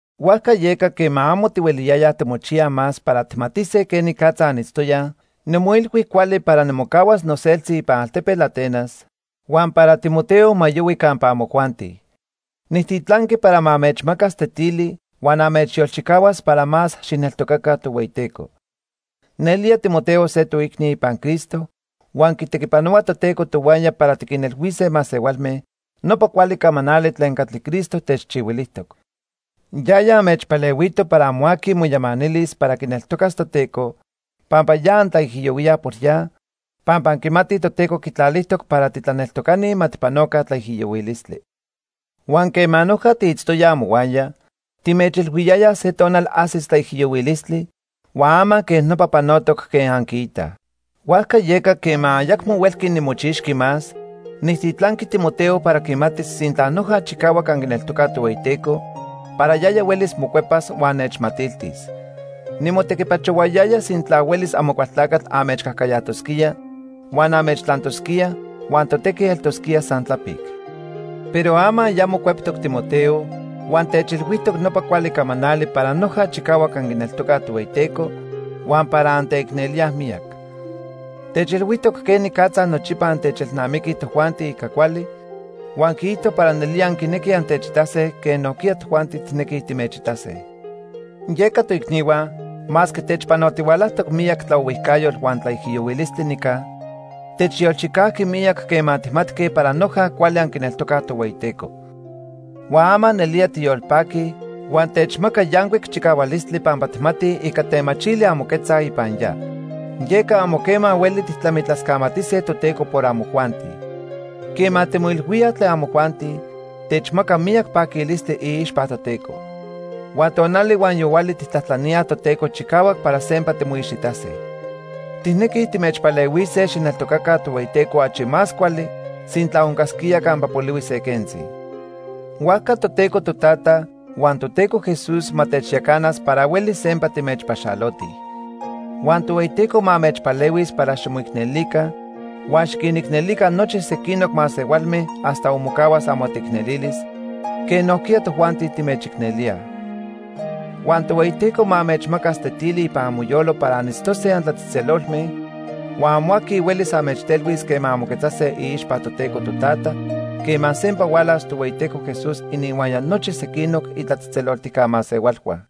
Huajca yeca, quema amo tihueliyayaj timochiyaj más para tijmatise quenicatza anitztoyaj, nimoilhui cuali para nimocahuas noseltzi ipan altepetl Atenas, huan para Timoteo ma yohui campa amojuanti. Nijtitlanqui para ma anmechmacas tetili huan anmechyolchicahuas para más xijneltocaca Tohueyiteco. Nelía Timoteo se toicni ipan Cristo huan quitequipanohua Toteco tohuaya para tiquinilhuise masehualme nopa cuali camanali tlen catli Cristo techchihuilijtoc. Yaya anmechpalehuito para amo aqui moyamanilis para quineltocas Toteco pampa ya antlaijiyohuíaj por ya, pampa anquimatij Toteco quitlalijtoc para titlaneltocani ma tijpanoca tlaijiyohuilistli. Huan quema noja tiitztoyaj amohuaya, timechilhuiyayaj se tonal ajsis tlaijiyohuilistli huan ama quej nopa panotoc quen anquiitaj. Huajca yeca, quema ayacmo huelqui nimochixqui más, nijtitlanqui Timoteo para quimatis sintla noja chicahuac anquineltocaj Tohueyiteco para yaya huelis mocuepas huan nechmatiltis. Nimotequipachohuayaya sintla huelis Amocualtlacatl anmechcajcayajtosquía huan anmechtlantosquía, huan totequi eltosquía san tlapic. Pero ama ya mocueptoc Timoteo, huan techilhuijtoc nopa cuali camanali para noja chicahuac anquineltocaj Tohueyiteco huan para anteicnelíaj miyac. Techilhuijtoc quenicatza nochipa antechelnamiquij tojuanti ica cuali, huan quiijto para nelía anquinequij antechitase quen nojquiya tojuanti tijnequij timechitase. Yeca toicnihua, masque techpanotihualajtoc miyac tlaohuijcayotl huan tlaijiyohuilistli nica, techyolchicajqui miyac quema tijmatque para noja cuali anquineltocaj Tohueyiteco. Huan ama nelía tiyolpaquij huan techmaca yancuic chicahualistli pampa tijmatij ica temachili anmoquetzaj ipan ya. Yeca amo quema hueli tijtlamitlascamatise Toteco por amojuanti. Quema timoilhuíaj tlen amojuanti, techmaca miyac paquilistli iixpa Toteco. Huan tonali huan yohuali tijtlajtlaníaj Toteco chicahuac para sempa timoixitase. Tijnequij timechpalehuise xijneltocaca Tohueyiteco achi más cuali sintla oncasquía campa polihui se quentzi. Huajca Toteco Totata huan Toteco Jesús ma techyacanas para huelis sempa timechpaxalotij. Huan Tohueyiteco ma anmechpalehuis para ximoicnelica huan xiquinicnelica nochi sequinoc masehualme hasta onmocahuas amoteicnelilis, quen nojquiya tojuanti timechicnelíaj. Huan Tohueyiteco ma anmechmacas tetili ipan amoyolo para anitztose antlatzejtzelolme, huan amo aqui huelis anmechtelhuis quema anmoquetzase iixpa Toteco Totata quema sempa hualas Tohueyiteco Jesús ininhuaya nochi sequinoc itlatzejtzeloltijca masehualhua.